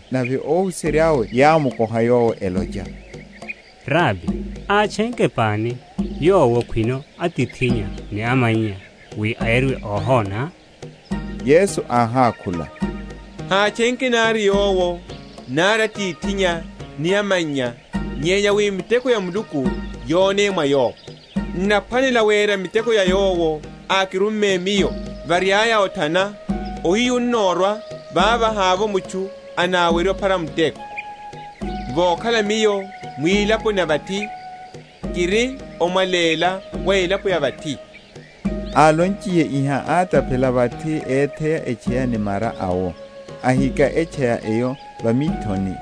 Nave óhuserya’we yámukoha Yowo, elocha, Rabi, átchenke pani, yowo, khwino atithinnya ni amannya, wi áyariwa óhona? Yesu áhákhula, Hátchenke nari yowo, nari atithinnya ni amannya; nyenya wi miteko ya Muluku yoneye mwa yowo. N’naphwanela wera miteko ya Yowo ákirumme Miyo, variaya othana; ohiyu onnorwa vavo havovo mutchu anawerye ophara muteko. Vokhala Miyo mwilaponi ya vathi, kiri omwaléla wa elapo ya vathi. Alonchiye iha, átaphela vathi, étheya etchaya ni mara awo, ahika etchaya eyo va mithoni,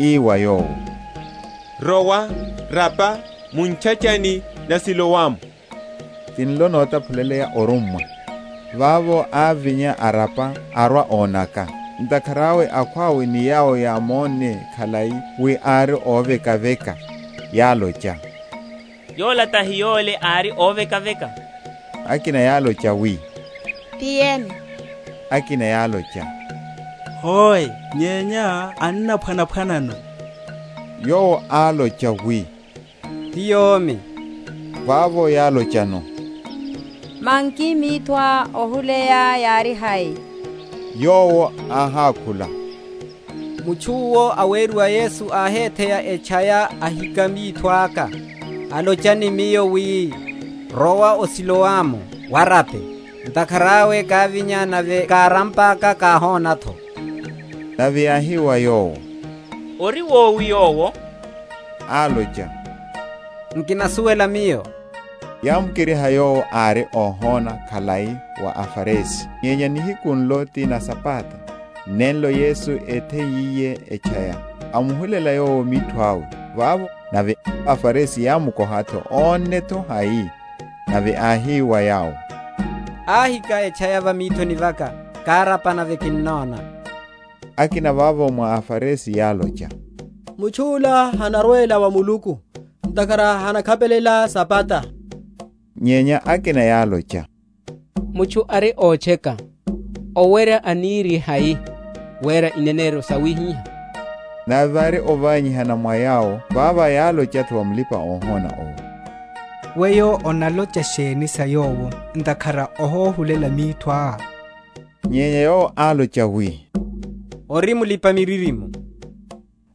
ii wa yowo, Rowa, rapa mu ntchachani na Siloamu (tinlo notaphuleya, Órummwa). Vavo ávinya, arapa, arwa ónaka. Ntakhara awe akhwawe ni yawo yámonne khalai, wi ári óvekaveka, yálocha, Yola tahi yole ári óvekaveka? Akina yálocha, wi, Ti yene; akina yálocha, Hoe, nyenya annaphwana?-?phwanano. Yowo álocha, wi, Ti yomi. Vavo yálochano, Manki mithoá ohuleya yári hai? Yowo áhákhula, Mutchu’wo aweriwa Yesu áhetheya etchaya ahika mitho aka, alocha ni miyo, wi, Rowa o Siloamu warape; ntakhara awe kávinya, nave kárampaka kihona’tho. Nave yáhi wa yowo, Ori wowi Yowo? Álocha, Nkinasuwela miyo. Yámukeriha yowo ári óhona khalai wa aFarisi. Nyenya nihiku nlo ti na Sabata nenlo Yesu étheiyiye etchaya, amuhulela yowo mitho awe. Vavo nave aFarisi yámukoha’tho, ónne’tho hai? Nave áhi wa yawo, Áhika etchaya va mithoni vaka, kárapa, nave kinnona. Akina vavo mwa aFarisi yálocha, Mutchu’la hanarwela wa Muluku, ntakhara hanakhapelela Sabata. Nyenya akina yálocha, Mutchu ari ótcheka owerya anirihai wera ineneryo sawihiha? Nave vári ovanyihana mwa yawo. Vavo yálocha’tho wa mulipa‐ohona owo, Weyo onalocha sheni sa Yowo, ntakhara óhohulela mithoá? Nyenya yowo álocha, wi, Ori mulipa‐miririmo.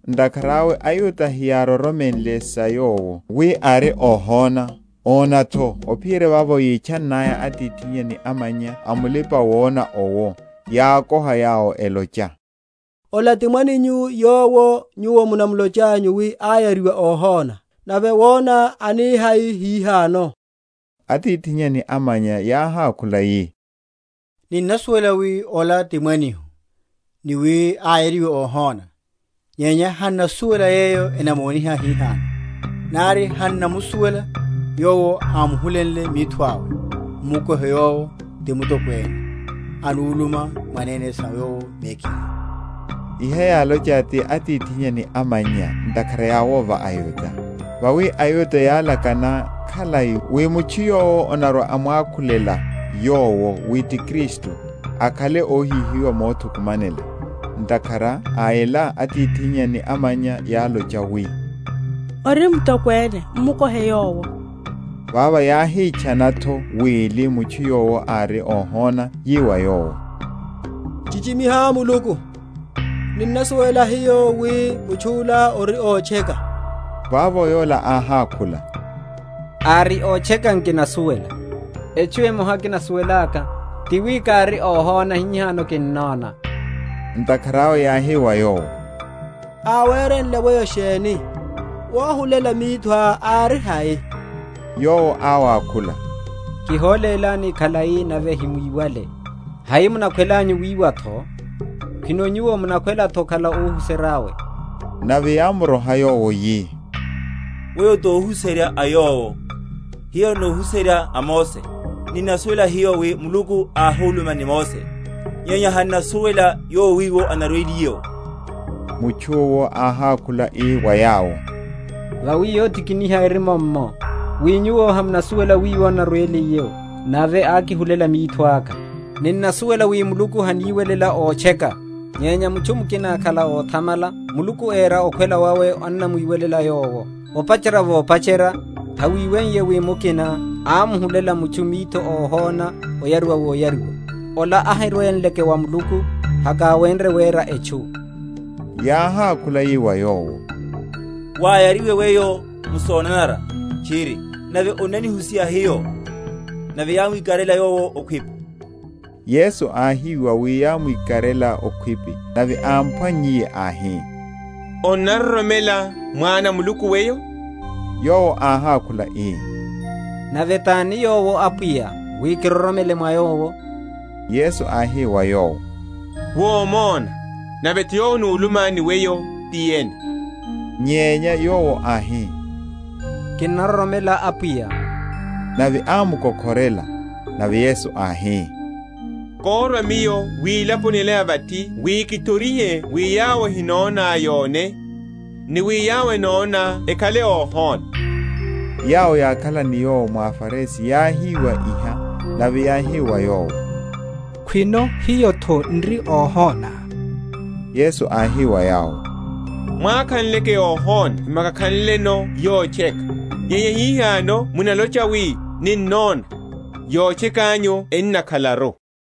Ntakhara awe aYuda heyároromenle sa yowo, wi ári óhona, óna’tho, ophiyerya vavo yítchannaya atithinnya ni amannya a mulipa‐wona owo; yákoha yawo, elocha, Ola ti mwaninyu, yowo nyuwo munalochanyu wi áyariwa óhona? Nave wona anihai hihano? Atithinnya ni amannya yáhákhula yi, Ninnasuwela wi ola ti mwanihu, ni wi áyariwa óhona; nyenya han’nasuwela yeyo enamoniha hihano; nari han’namusuwela Yowo ámuhulenle mitho awe; m’mukohe yowo; ti mutokwene; anuluma mwanene sa yowo mekhiye. Iha yálonche ti atithinnya ni amannya ntakhara yáwova aYuda: vawi aYuda yálakana khalai, wi mutchu yowo anarwa‐amwakhulela Yowo wi ti Kristu, akhale óhihiwa mothukumanela. Ntakhara a ela atithinnya ni amannya yálocha, wi, Ori mutokwene; m’mukohe yowo. Vavo yáhitchana’tho wili mutchu yowo ári óhona, yi wa yowo, Chichimiha Muluku: ninnasuwela niyo wi mutchu’la ori ótcheka. Vavo yola áhákhula, Ári ótcheka, nkinasuwela: etchu emoha kinasuwelaka, ti wi kári óhona, hihano kinnona. Ntakhara awe yáhi wa yowo, Áwerenle weyo sheni? wohulela mithoá ári hai? Yowo áwakhula, kiholélani khalai, nave hamwíwale; hai munakhwelanyu wiwa’tho? khwino nyuwo’tho munakhwela okhala óhuserya’we? Nave yámuroha yowo, yi, Weyo tohuserya a Yowo; hiyo nóhuserya a Mose. Ninnasuwela hiyo wi Muluku áhuluma ni Mose: nyenya han’nasuwela Yowo wiwo anarweliye’wo. Mutchu’wo áhákhula ii wa yawo, Vawi yotikiniha eri mummo, wi nyuwo hamunasuwela wiwo anarweliye’wo, nave ákihulela mitho aka. Ninnasuwela wi Muluku haniwelela ótcheka. Nyenya mutchu mukina akhala óthamala Muluku éra okhwela wawe annamwiwelela yowo. Opacherya vopacherya hawiweiye wi mukina ámuhulela mitho mutchu óhona oyariwa woyariwa. Ola ahirwenleke wa Muluku, hakáwenrye wera etchu. Yáhákhula yi wa yowo, Wáyariwe weyo m’sonanara tchiri, nave onnanihusiha hiyo? Nave yámwikarela yowo okhwipi. Yesu áhiwa wi yámwikarela okhwipi; nave ámphwannyiye áhi, Onnaroromela Mwana a Muluku weyo? Yowo áhákhula ii, Nave tani Yowo, Apwiya, wi karoromele mwa Yowo? Yesu áhi wa yowo, Womona, nave’tho yowo anuluma ni weyo ti yene. Nyenya yowo áhi, Kinnaroromela, Apwiya; nave ámuko?-?khorela. Nave Yesu áhi, Kórwa Miyo wilaponi ela ya vathi wi kithorihe wi yawo ehinona yone; ni wi yawo enona ekhale óhona. Yawo yákhala ni Yowo mwa aFarisi yáhiwa iha, nave yáhi wa Yowo, Khwino hiyo’tho n’ri óhona? Yesu áhi wa yawo, Mwákhanleke óhona hemwákakhanleno yotcheka; nyenya hihano munalocha, wi, Ninnona: yotcheka’nyu enna?-?khalaru.